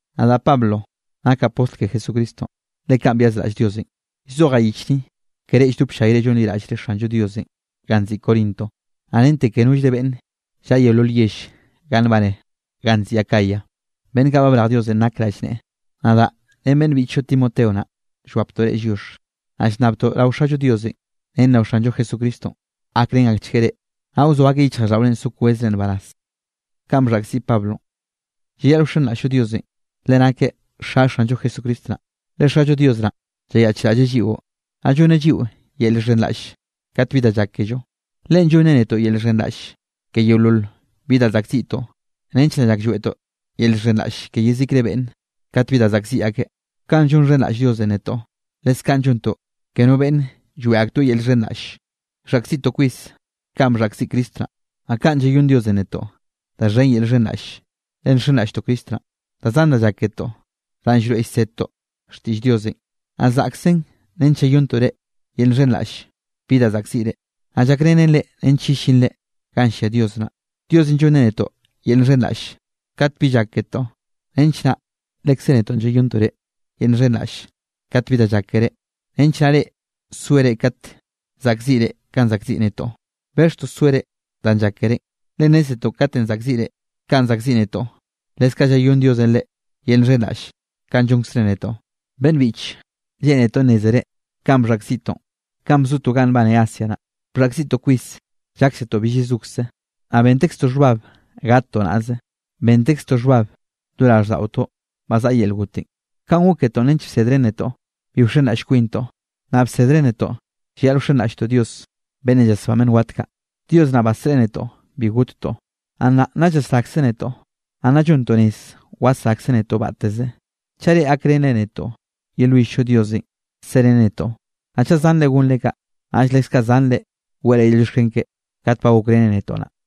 Nadaꞌ Pablo nakaꞌ postl ke Jesucristonꞌ, le kaꞌn byazraꞌll Diosenꞌ. Llzojaꞌ yich ni ke reꞌ lldop ll-llayre llonliraꞌllre Xanllo Diosenꞌ ganꞌ nziꞌi Corinto, naꞌ rente ke nollre beꞌnn llaꞌa yeolol yell ganꞌ nbane ganꞌ nziꞌi Acaya, beꞌnn kaꞌ ba brej Diosenꞌ nak rallneꞌe. Nadaꞌ naꞌ ren beꞌnn biꞌchllo Timoteo naꞌ, llwaptoꞌ reꞌ lliox. Naꞌ llnnabtoꞌ rao Xallo Diosenꞌ ren rao Xanllo Jesucristonꞌ gakrén akchgueꞌ reꞌ, naꞌ wzoa akeꞌ yichjraꞌlldaꞌore so kwezre nbaraz. Llayaꞌl wxenraꞌll-llo Diosenꞌ, le nakeꞌ Xa Xanllo Jesucristo naꞌ. Le Xallo Dios naꞌ llayaꞌchraꞌlleꞌ lliꞌo, naꞌ llonneꞌ lliꞌo yel llxhenraꞌll kat bi da llak kello. Leꞌen llonneꞌ netoꞌ yel llxhenraꞌll ke yeolol bi da zaꞌkziꞌtoꞌ nench naꞌ lloeꞌtoꞌ yel llxhenraꞌll ke yezikre beꞌnne kate bi da zaꞌkziꞌ akeꞌ. Kanꞌ llonxhenraꞌll Diosenꞌ netoꞌ, leskaꞌn llontoꞌ ke no beꞌnne lloeꞌ aktoeꞌ yel llxhenraꞌlle. Llzaꞌkziꞌtoꞌ kwis kanꞌ bxhaꞌkziꞌ Cristo naꞌ, naꞌ kaꞌn llayónn Diosenꞌ netoꞌ da xhen yel llxhenraꞌlle le nxenraꞌlltoꞌ Cristo naꞌn. Da zan da llak ketoꞌ danꞌ llroeꞌ llsedtoꞌ xtiꞌll Diosenꞌ, naꞌ zaꞌksen nench llayonntoꞌ reꞌ yel llxhenraꞌll bi da zaꞌkziꞌre, naꞌ llakrenen reꞌ nench yellinre ganꞌ llia Dios naꞌ. Diosenꞌ llonneꞌ netoꞌ yel llxhenraꞌll kat bi llak ketoꞌ nench naꞌ lekze netoꞌ llayonntoꞌ reꞌ yel llxhenraꞌll kat bi da llak keré, nench naꞌ reꞌ soere kat zaꞌkziꞌre kanꞌ zaꞌkziꞌ netoꞌ. Bexhtoꞌ soere danꞌ llak kerénꞌ, le nnézetoꞌ katenꞌ zaꞌkziꞌre kanꞌ zaꞌkziꞌ netoꞌ, leskaꞌ llayónn Diosenꞌ reꞌ yel llxhenraꞌll kanꞌ llonkzreꞌ netoꞌ. Beꞌnn biꞌche lleꞌnetoꞌ nnézere kanꞌ bxhaꞌkziꞌtoꞌ kanꞌ bzotoꞌ ganꞌ nbaneꞌ Asia naꞌ. Bxhaꞌkziꞌtoꞌ kwis, lláksetoꞌ bill yezokze, naꞌ bentekztoꞌ xhbab gattoꞌ naꞌze. Bentekztoꞌ xhbab lo raꞌlldaꞌotoꞌ ba zaꞌa yel gotenꞌ. Kanꞌ gok ketoꞌ nench bsedren netoꞌ bi wxenraꞌll kwintoꞌ, naꞌ bsedren netoꞌ llayaꞌl wxenraꞌlltoꞌ Dios beꞌnnenꞌ llasbán beꞌnn wat kaꞌ. Dios naꞌ basreꞌe netoꞌ bi gottoꞌ. Naꞌ nnaꞌ nna llasrakzeꞌ netoꞌ. Naꞌ nna llontoꞌ rez wasrakzeꞌ netoꞌ batteze, chaꞌ reꞌ gakrenre netoꞌ yelwill-llo Diosenꞌ sereneꞌ netoꞌ. Naꞌ chaꞌ zanre gonre kaꞌ, naꞌll leskaꞌ zanre weꞌre yel llioxken keꞌe kat ba gokreneꞌ netoꞌ naꞌ.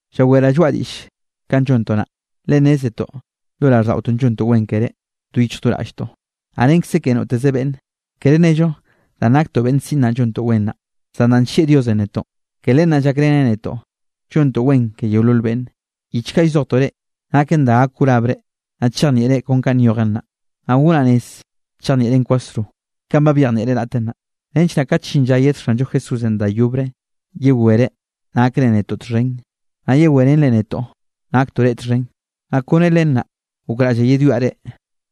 Llaweraꞌ lloaꞌa diꞌll kanꞌ llontoꞌ naꞌ, le nnézetoꞌ lo raꞌlldaꞌotoꞌ llontoꞌ wen keré, do yichj do raꞌlltoꞌ, naꞌ renkze ke noteze beꞌnne. Kere nello danꞌ naktoꞌ beꞌnn siꞌn naꞌ llontoꞌ wen naꞌ, zan danꞌ nllieꞌ Diosenꞌ netoꞌ, ke len naꞌ llakreneꞌ netoꞌ llontoꞌ wen ke yeolol beꞌnne. Yich kaꞌ llzojtoꞌ reꞌ, naken da gak wrabre, naꞌ chejnieꞌre kon kanꞌ nyojen naꞌ, naꞌ gonaꞌ rez chejnieꞌren kwasro, kanꞌ ba byejnieꞌren raꞌt naꞌ, nench naꞌ kat llin lla yed Xanllo Jesúsenꞌ da yobre, yewere nakre netoꞌ txhen, naꞌ yewé ren netoꞌ naktoꞌ reꞌ txhen. Naꞌ kone len naꞌ gokraꞌllaꞌ yedwiaꞌ reꞌ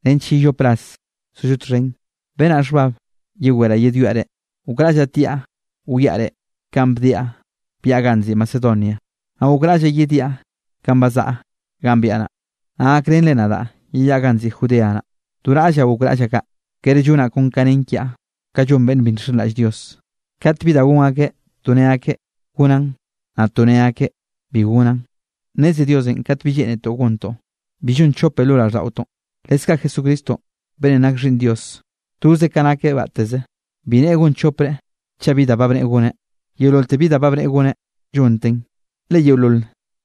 nench yellop rase sollo txhen, benaꞌ xhbab yewere yedwiaꞌ reꞌ. Gokraꞌllaꞌ tiaꞌ wiaꞌ reꞌ kanꞌ bdiaꞌ byaꞌa ganꞌ nziꞌi Macedonia, naꞌ gokraꞌllaꞌ yediaꞌ kanꞌ bazaꞌa ganꞌ byaꞌa naꞌ. Naꞌ gakrenre nadaꞌ yeyaꞌa ganꞌ nziꞌi Judea naꞌ. Do raꞌllaꞌ gokraꞌllaꞌ kaꞌ, kere llonaꞌ kon ka nen kiaꞌ kanꞌ llon beꞌnn bi nxenraꞌll Dios, kat bi da gon akeꞌ to ne akeꞌ: “Gonaꞌn”, naꞌ to ne akeꞌ: “Bi gonaꞌn”. Nneze Diosenꞌ kat binꞌ lleꞌnetoꞌ gontoꞌ, bi llon chope lo raꞌlldaꞌotoꞌn. Leskaꞌ Jesucristonꞌ beꞌnnenꞌ nak Xhiꞌnn Dios, toze ka nakeꞌ batteze, bi nne gon chopre chaꞌ bi da bneꞌe goneꞌ. Yeololte bi da ba bneꞌe goneꞌ, llonteꞌn. Le yeolol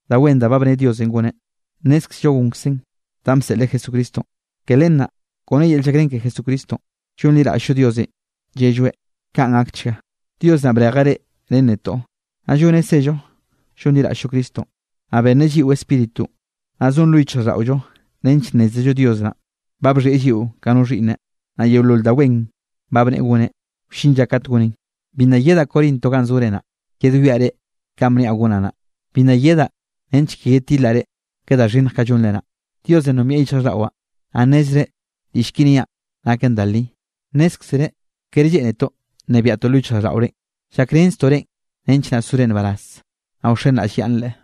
da wen ba bne Diosenꞌ goneꞌ, nnézkzello gonkzeꞌn danꞌ bseꞌleꞌ Jesucristonꞌ. Ke len naꞌ kone yel llakrén ke Jesucristonꞌ, llonliraꞌll-llo Diosenꞌ llelloeꞌ: “Kaꞌn gakchga.” Dios naꞌ brejeꞌ reꞌ ren netoꞌ, naꞌ lloneꞌ zello llonliraꞌll-llo Cristonꞌ. Naꞌ benneꞌ lliꞌo Spíritunꞌ, naꞌ zon lo yichjraꞌlldaꞌollonꞌ nench nnézello Dios naꞌ ba bxhieꞌ lliꞌo ka no xhiꞌnneꞌ, naꞌ yeolol da wen ba bneꞌe goneꞌ, wllin lla kat goneꞌn. Bi nna yedaꞌ Corinto ganꞌ zore naꞌ, yedwiaꞌ reꞌ kanꞌ bniaꞌ gonaꞌ naꞌ, bi nna yedaꞌ nench ke yedtilaꞌ reꞌ ke da xhinnj kaꞌ llonre naꞌ. Diosenꞌ nombieꞌ yichjraꞌlldaꞌwaꞌ, naꞌ nnezreꞌ diꞌll ki niaꞌn naken da li. Nnézkzere kere lleꞌnetoꞌ nnebiaꞌtoꞌ lo yichjraꞌlldaꞌore; llakrenztoꞌ reꞌn nench naꞌ sore nbaraz, naꞌ wxenraꞌllyaꞌnnre.